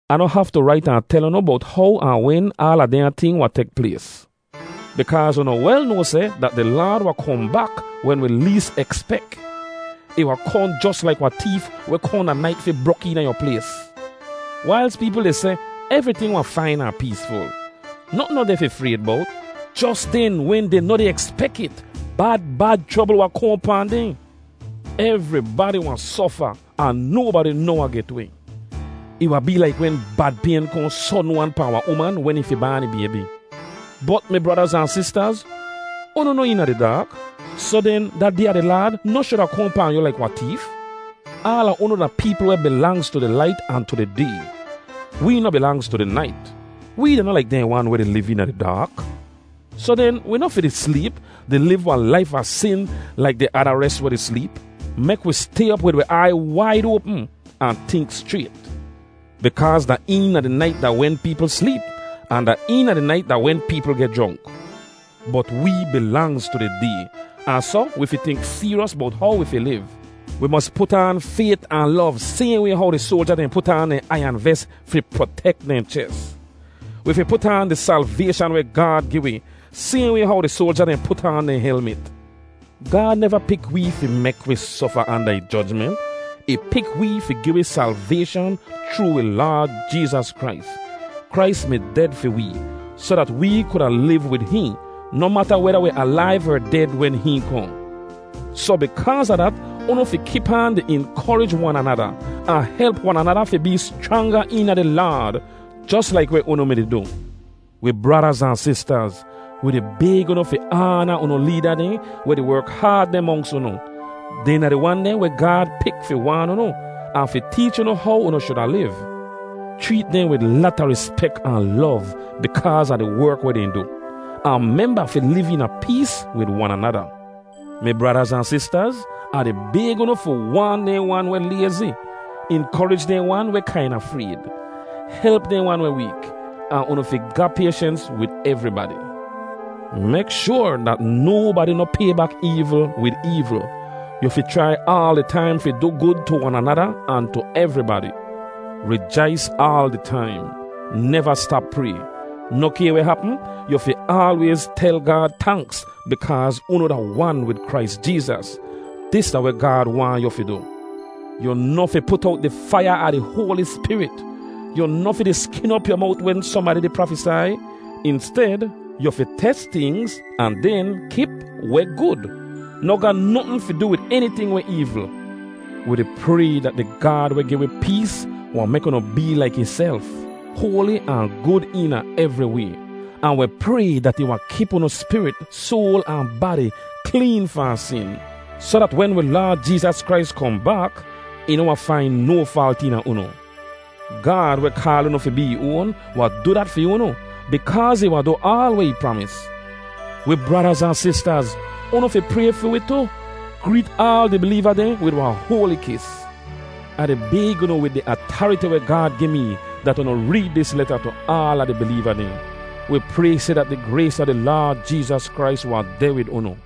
Ah noh haftu rait ahn tel unu bowt how ahn wen aala dehnya ting wahn tek plays, bikaaz unu wel noa seh dat di Laad wahn kohn bak wen wi lees ekspek. Ih wahn kohn jos laik wahn teef weh kohn da nait fi brok eena yu plays. Wailz peepl di seh, “Evriting wahn fain ahn peesful. Notn noh deh fi frayd bowt,” jos den, wen dehn noh di ekspek it, bad, bad chrobl wahn kohn pahn dehn. Evribadi wahn sofa ahn nobadi noh wahn get weh. Ih wahn bee laik wen bad payn kohn sodn-wan pahn wahn uman wen ih fi baan ih baybi. Bot mi bradaz ahn sistaz, unu noh eena di daak. Soh den, da Day a di Laad noh shuda kohn pahn yu laik wahn teef. Aala unu da peepl weh bilangz tu di lait ahn tu di day. Wee noh bilangz tu di nait. Wee da noh laik dehn wan weh di liv eena di daak. Soh den, wi noh fi di sleep, di liv wahn laif a sin laik di ada res weh di sleep. Mek wi stay op wid wi aiy waid oapm ahn tink schrayt. Bikaaz da eena di nait da wen peepl sleep, ahn da eena di nait da wen peepl geh jronk. Bot wee bilangz tu di day, ahn soh wi fi tink seeryos bowt how wi fi liv. Wi mos put aan fayt ahn lov sayhn way how di soalja dehn put aan dehn aiyan ves fi protek dehn ches. Wi fi put aan di salvayshan weh Gaad gi wi, sayhn way how di soalja dehn put aan dehn helmit. Gaad neva pik wee fi mek wi sofa anda ih jojment. Ih pik wee fi gi wi salvayshan chroo wi Laad Jeezas Krais. Krais mi ded fi wee, soh dat wee kuda liv wid hihn, noh mata weda wi alaiv er ded wen hihn kohn. Soh bikaaz a dat, unu fi kip aan di inkorij wan anada, ahn help wan anada fi bee schranga eena di Laad, jos laik weh unu mi-di du. Wi bradaz ahn sistaz, wi di bayg unu fi aana unu leeda dehn weh di werk haad deh monks unu. Dehn da di wan dehn weh Gaad pik fi waan unu, ahn fi teech unu how unu shuda liv. Chreet dehn wid lata rispek ahn lov bikaaz a di werk weh dehn du. Ahn memba fi liv eena pees wid wan anada. Mi bradaz ahn sistaz, Ah di bayg unu fi waan dehn wan weh layzi. Inkorij dehn wan weh kaina frayd. Help dehn wan weh week, ahn unu fi ga payshens wid evribadi. Mek shoar dat nobadi noh pay bak eevl wid eevl. Yu fi chrai aal di taim fi du gud tu wan anada ahn tu evribadi. Rijais aal di taim. Neva stap pray. Noh kay weh hapm, yu fi aalwayz tel Gaad tanks bikaaz unu da wan wid Krais Jeezas. Dis da weh Gaad waahn yu fi du. Yu noh fi put owt di faiya a di Hoali Spirit. Yu noh fi di skin op yu mowt wen sohnbadi di prafesai. Insted, yu fi tes tingz ahn den kip weh gud. Noh ga notn fi du wid eniting weh eevl. Wi di pray dat di Gaad weh gi wi pees wahn mek unu bee laik ihself, hoali ahn gud eena evri way. Ahn wi pray dat ih wahn kip unu spirit, soal ahn badi kleen fahn sin, soh dat wen wi Laad Jeezas Krais kohn bak, ih noh wahn fain no faalt eena unu. Gaad weh kaal unu fi bee ih oan wahn du dat fi unu, bikaaz ih wahn du aal weh ih pramis. Wi bradaz ahn sistaz, unu fi pray fi wi tu. Greet aal di bileeva dehn wid wahn hoali kis. Ah di bayg unu wid di atariti weh Gaad gi mee dat unu reed dis leta tu aala di bileeva dehn. Wi pray seh dat di grays a di Laad Jeezas Krais wahn deh wid unu.